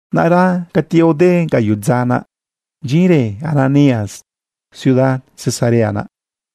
Naꞌra cati aode gaꞌyoꞌ dza naꞌ, bdyinrë Ananías ciudad Cesarea naꞌ,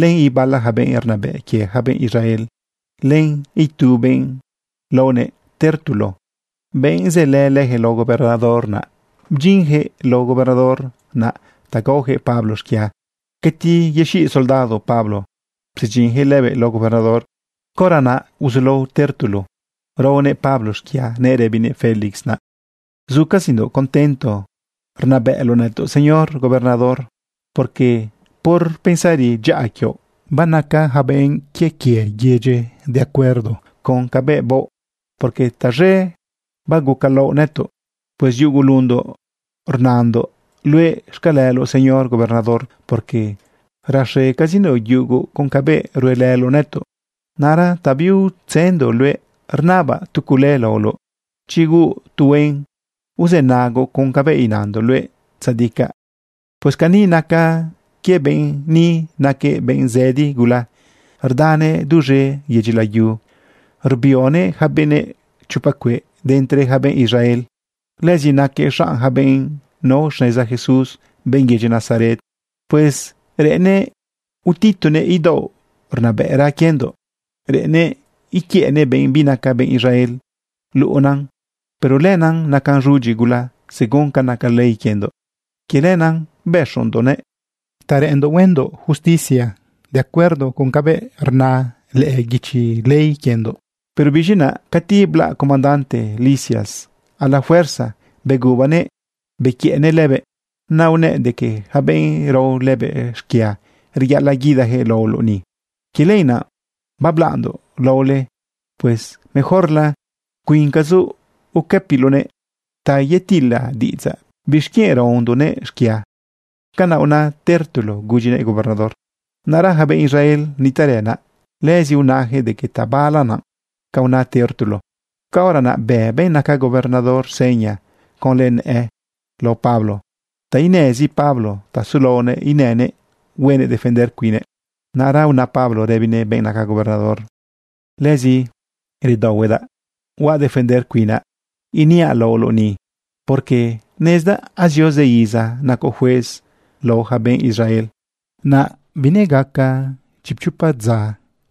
len ibala yaca benꞌ rnabëꞌ quie ja benꞌ Israel, len itu benꞌ laonëꞌ Tértulo, benꞌ sëlë leyaquëꞌ lao gobernador naꞌ. Bdyinyaquëꞌ lao gobernador naꞌ ta gaoyaquëꞌ Pablo xquia. Cati yexiꞌ soldado Pablo psedyinjëꞌ lëbëꞌ lao gobernador, caora naꞌ uzulao Tértulo raonëꞌ Pablo xquia nëꞌ rëbinëꞌ Félix naꞌ: ―Zucazindoꞌ contento rnabëꞌloꞌ nëtoꞌ, Señor Gobernador, porque por pensari dyaꞌa quioꞌ, banaca ja benꞌ quie quie yedyi de acuerdo con cabëꞌ baoꞌ, porque taz̃e bagucalaoꞌ nëtoꞌ. Pues yugulundoꞌ rnandoꞌ luëꞌ xcaleloꞌ, Señor Gobernador, porque raxecazindoꞌ yugu con cabëꞌ ruelëloꞌ nëtoꞌ. Naꞌra ta biutzëndoꞌ luëꞌ, rnabaꞌ tu cule laoloꞌ, chi huuꞌ tu huen, uzënagoꞌ con cabëꞌ inandoꞌ luëꞌ tzadicaꞌ. Pues cani nacan quie benꞌ ni naquëꞌ benꞌ zëdi gula. Rdanëꞌ duz̃e yedyi layu rbionëꞌ yaca benëꞌ chopa cueꞌ de entre yaca benꞌ Israel. Lëzi naquëꞌ xanꞌ ja benꞌ nao xneza Jesús, benꞌ yedyi Nazaret. Pues reꞌennëꞌ utitunëꞌ idaoꞌ rnabëꞌra quiendoꞌ. Reꞌennëꞌ iquiëꞌnëꞌ benꞌ binaca benꞌ Israel luꞌe naꞌ. Pero lenaꞌ nacan z̃udyi gula según ca naca ley quiendoꞌ. Quie lenaꞌ bëxondoꞌnëꞌ ta reꞌenndoꞌ huendoꞌ justicia de acuerdo con cabëꞌ rna lëꞌë guichi ley quiendoꞌ. Pero biz̃i naꞌ cati blaꞌ comandante Lisias, a la fuerza begubanëꞌ bequiëꞌnëꞌ lëbëꞌ. Naꞌ unëꞌ de que yaca benꞌ rao lëbëꞌ xquia reyaꞌalaꞌ guidajëꞌ laoloꞌ ni. Quie lenaꞌ bablaꞌndoꞌ laole. Pues mejorla cuincazoꞌ uquëpiloꞌnëꞌ ta yetila diꞌidzaꞌ bixquienꞌ raondoꞌnëꞌ xquia. ―Canaꞌ una Tértulo gudyinëꞌ gobernador. Naꞌra yaca benꞌ Israel nitaꞌrë naꞌ, lëzi unayaquëꞌ de que tabala naꞌ ca una Tértulo. Caora naꞌ bë benꞌ naca gobernador seña conlë nëꞌë lao Pablo ta inezi Pablo ta sulaonëꞌ inënëꞌ huenëꞌ defender cuinnëꞌ. Naꞌ una Pablo rëbinëꞌ benꞌ naca gobernador: ―Legazi redaohuedaꞌ huaꞌ defender cuinaꞌ iniaꞌ laoloꞌ ni, porque nezdaꞌ azio zë iza nacoꞌ juez lao ja benꞌ Israel. Naꞌ binegaca chipchopa dza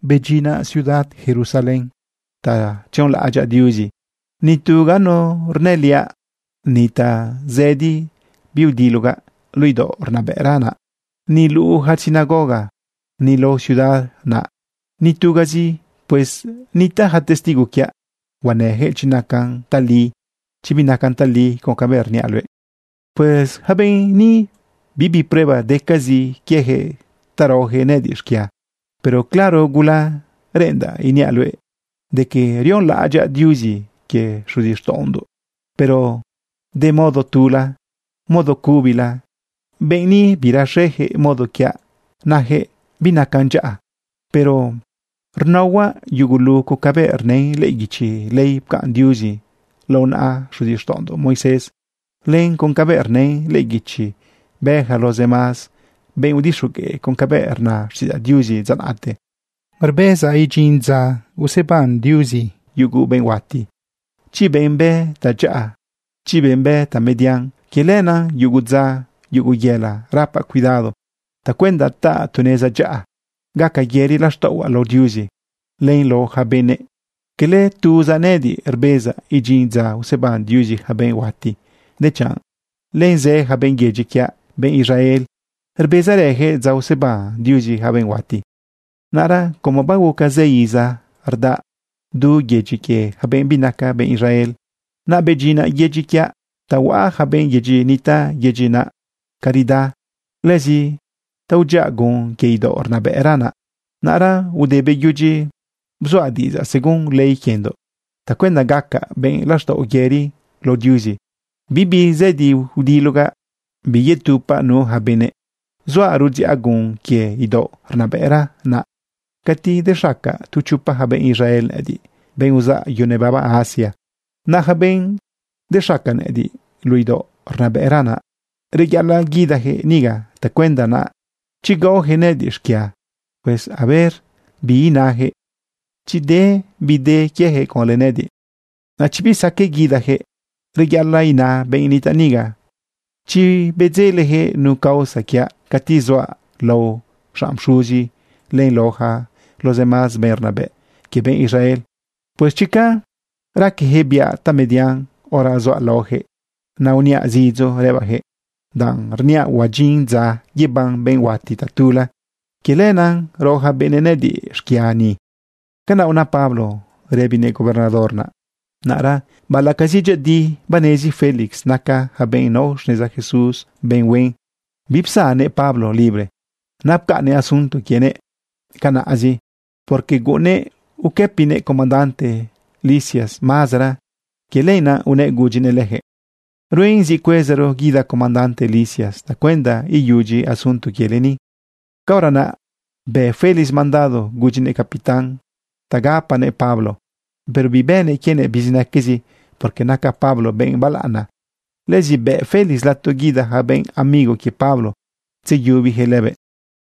bedyinaꞌ ciudad Jerusalén ta tzionlaꞌadyaꞌ Diuzi. Nitu ganu rnëliaꞌ, ni tazëdi biudilogaꞌ luꞌu idaoꞌ rnabëꞌra naꞌ, ni luꞌu yaca sinagoga, ni lao ciudad naꞌ, nitugazi. Pues nitaꞌ ja testigo quiaꞌ. Huanëyaquëꞌ chi nacan tali, chi binacan tali, con cabëꞌ rniaꞌ luëꞌ. Yaca benꞌ ni, bibi prueba decazi quiejëꞌ danꞌ raoyaquëꞌ nëꞌëdiꞌ xquia. Pero claro gula reꞌendaꞌ iniaꞌ luëꞌ de que rionlaꞌadyaꞌ Diuzi quie xuzixtaꞌondoꞌ, pero de modo tula, modo cubila. Benꞌ ni biraxeyaquëꞌ modo quiaꞌ nayaquëꞌ binacan dyaꞌa. Pero rnaohuaꞌ yugulu con cabëꞌ rnën lëꞌë guichi ley pcaꞌn Diuzi lao naꞌa xuzixtaꞌondoꞌ Moisés len con cabëꞌ rnën lëꞌë guichi bë yaca los demás benꞌ udixogueꞌ con cabëꞌ rna xtiꞌidzaꞌ Diuzi dza naꞌte. Rbezaꞌ idyin dza useban Diuzi yugu benꞌ huati, chi benꞌ bë tadyaꞌa, chi benꞌ bë tamedian. Quie lenaꞌ yugu dza, yugu yëla, rapaꞌ cuidado tacuenda taꞌa tu neza dyaꞌa, gaca yëri laxtaꞌohuaꞌ lao Diuzi, len lao yaca benëꞌ. Cala tuzaꞌ nëꞌëdiꞌ rbezaꞌ idyin dza useban Diuzi yaca benꞌ huati, dechanꞌ len zë ja benꞌ yedyi quiaꞌ, benꞌ Israel, rbezarëyaquëꞌ dza useban Diuzi yaca benꞌ huati. ’Naꞌra como baguca zë iza rdaꞌa du yedyi quie ja benꞌ binaca benꞌ Israel, naꞌ bedyinaꞌ yedyi quiaꞌ ta huaꞌa yaca benꞌ yëchiꞌ nitaꞌ yedyi naꞌ caridad, lëzi ta udziꞌa gun quie idaoꞌ rnabëꞌra naꞌ. Naꞌra ude beyudyi bzuaꞌ diꞌidzaꞌ según ley quiendoꞌ tacuenda gacaꞌ benꞌ laxtaꞌo yëri lao Diuzi, bibi zëdi udilogaꞌ, biyetupaꞌ nu yaca benëꞌ. Zuaꞌ rudziꞌa gun quie idaoꞌ rnabëꞌra naꞌ cati dexaca tu chopa ja benꞌ Israel nëꞌëdiꞌ, benꞌ uzaꞌ yu nebaba Asia. Naꞌ yaca benꞌ dexaca nëꞌëdiꞌ luꞌu idaoꞌ rnabëꞌra naꞌ, reyaꞌalaꞌ guidajëꞌ niga tacuenda naꞌ chi gaoyaquëꞌ nëꞌëdiꞌ xquia. Pues a ver bi inayaquëꞌ chi de bi de quiejëꞌ conlë nëꞌëdiꞌ. Naꞌ chi bisaqueꞌ guidajëꞌ, reyaꞌalaꞌ ina benꞌ nitaꞌ niga chi bedzelejëꞌ nu causa quiaꞌ cati zuaꞌ lao xanꞌ pxuzi len lao yaca los demás benꞌ rnabëꞌ quie benꞌ Israel. Pues chica raqueyaquëꞌ biaꞌ tamedian hora zuaꞌ laoyaquëꞌ naꞌ uniaꞌ zidzo rëbaꞌyaquëꞌ: “Danꞌ rniaꞌ huadyin dza yeban benꞌ huati tatula, quie lenaꞌ rao yaca benëꞌ nëꞌëdiꞌ xquia ni.” ―Canaꞌ una Pablo rëbinëꞌ gobernador naꞌ. Naꞌra baꞌalaꞌcazi dyëꞌëdi banezi Félix naca ja benꞌ nao xneza Jesús benꞌ huen, bipsannëꞌ Pablo libre. Naꞌ pcaꞌnnëꞌ asunto quienëꞌ canaꞌzi, porque guꞌunnëꞌ uquëpinëꞌ comandante Lisias mazara. Quie lenaꞌ unëꞌ gudyinëꞌ lejëꞌ: ―Ruen zi cuezaro guida comandante Lisias tacuenda iyudyi asunto quiele ni. Caora naꞌ bë Félix mandado gudyinëꞌ capitán ta gapanëꞌ Pablo, pero bibënëꞌ quienëꞌ bizinaquezi, porque naca Pablo benꞌ balaꞌana. Lëzi bëꞌ Félix lato guida ja benꞌ amigo quie Pablo tzeyubijëꞌ lëbëꞌ.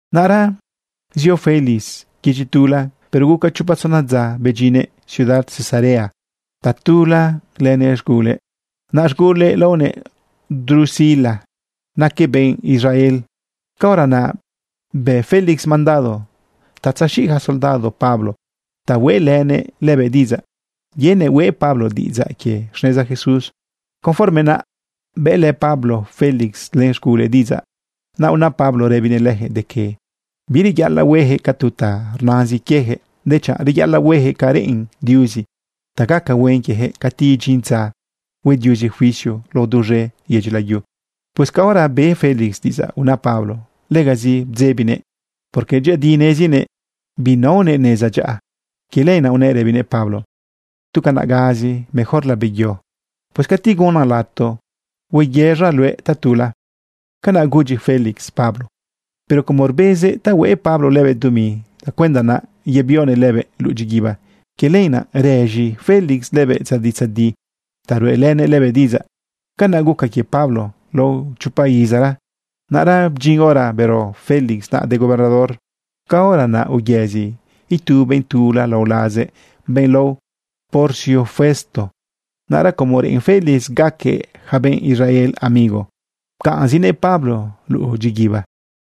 Naꞌra zio Félix yedyi tula, pero guca chopa tzona dza bedyinnëꞌ ciudad Cesarea tatula lënëꞌ z̃gulëꞌ. Naꞌ z̃gulëꞌ laonëꞌ Drusila, naquëꞌ benꞌ Israel. Caora naꞌ beꞌ Félix mandado ta tzexiꞌ soldado Pablo ta hueꞌlënëꞌ lëbëꞌ diꞌidzaꞌ yenëꞌ hueꞌ Pablo diꞌidzaꞌ quie xneza Jesús. Conforme naꞌ, bëꞌlë Pablo Félix len z̃gulëꞌ diꞌidzaꞌ. Naꞌ una Pablo rëbinëꞌ leyaquëꞌ de que bireyaꞌalaꞌ hueyaquëꞌ ca tu ta rnazin quieyaquëꞌ, dechanꞌ reyaꞌalaꞌ hueyaquëꞌ ca reꞌen Diuzi ta gaca huen quieyaquëꞌ cati idyin dza hue Diuzi juicio lao duz̃e yedyi layu. Pues caora be Félix diꞌidzaꞌ una Pablo, legazi bdzebinëꞌ, porque dyëꞌëdi nezinëꞌ binaonëꞌ neza dyaꞌa. Quie lenaꞌ unëꞌ rëbinëꞌ Pablo: ―Tu canaꞌgazi, mejorla beyo. Pues cati gunan lato hueyëz̃aꞌ luëꞌ tatula. Canaꞌ gudyi Félix Pablo. Pero como rbezëꞌ ta hueꞌ Pablo lëbëꞌ dumi tacuenda naꞌ yebionëꞌ lëbëꞌ luꞌu dyiguiba, quie lenaꞌ rëz̃i Félix naꞌ lëbëꞌ tzadi tzadi ta ruꞌelënëꞌ lëbëꞌ diꞌidzaꞌ. Canaꞌ guca quie Pablo lao chopa izara. Naꞌra bdyin hora bero Félix naꞌ de gobernador. Caora naꞌ uyëzi itu benꞌ tula lao lazëꞌ, benꞌ lao Porcio Festo. Naꞌra como reꞌen Félix gaquëꞌ yaca benꞌ Israel amigo, pcaꞌnzinëꞌ Pablo luꞌu dyiguiba.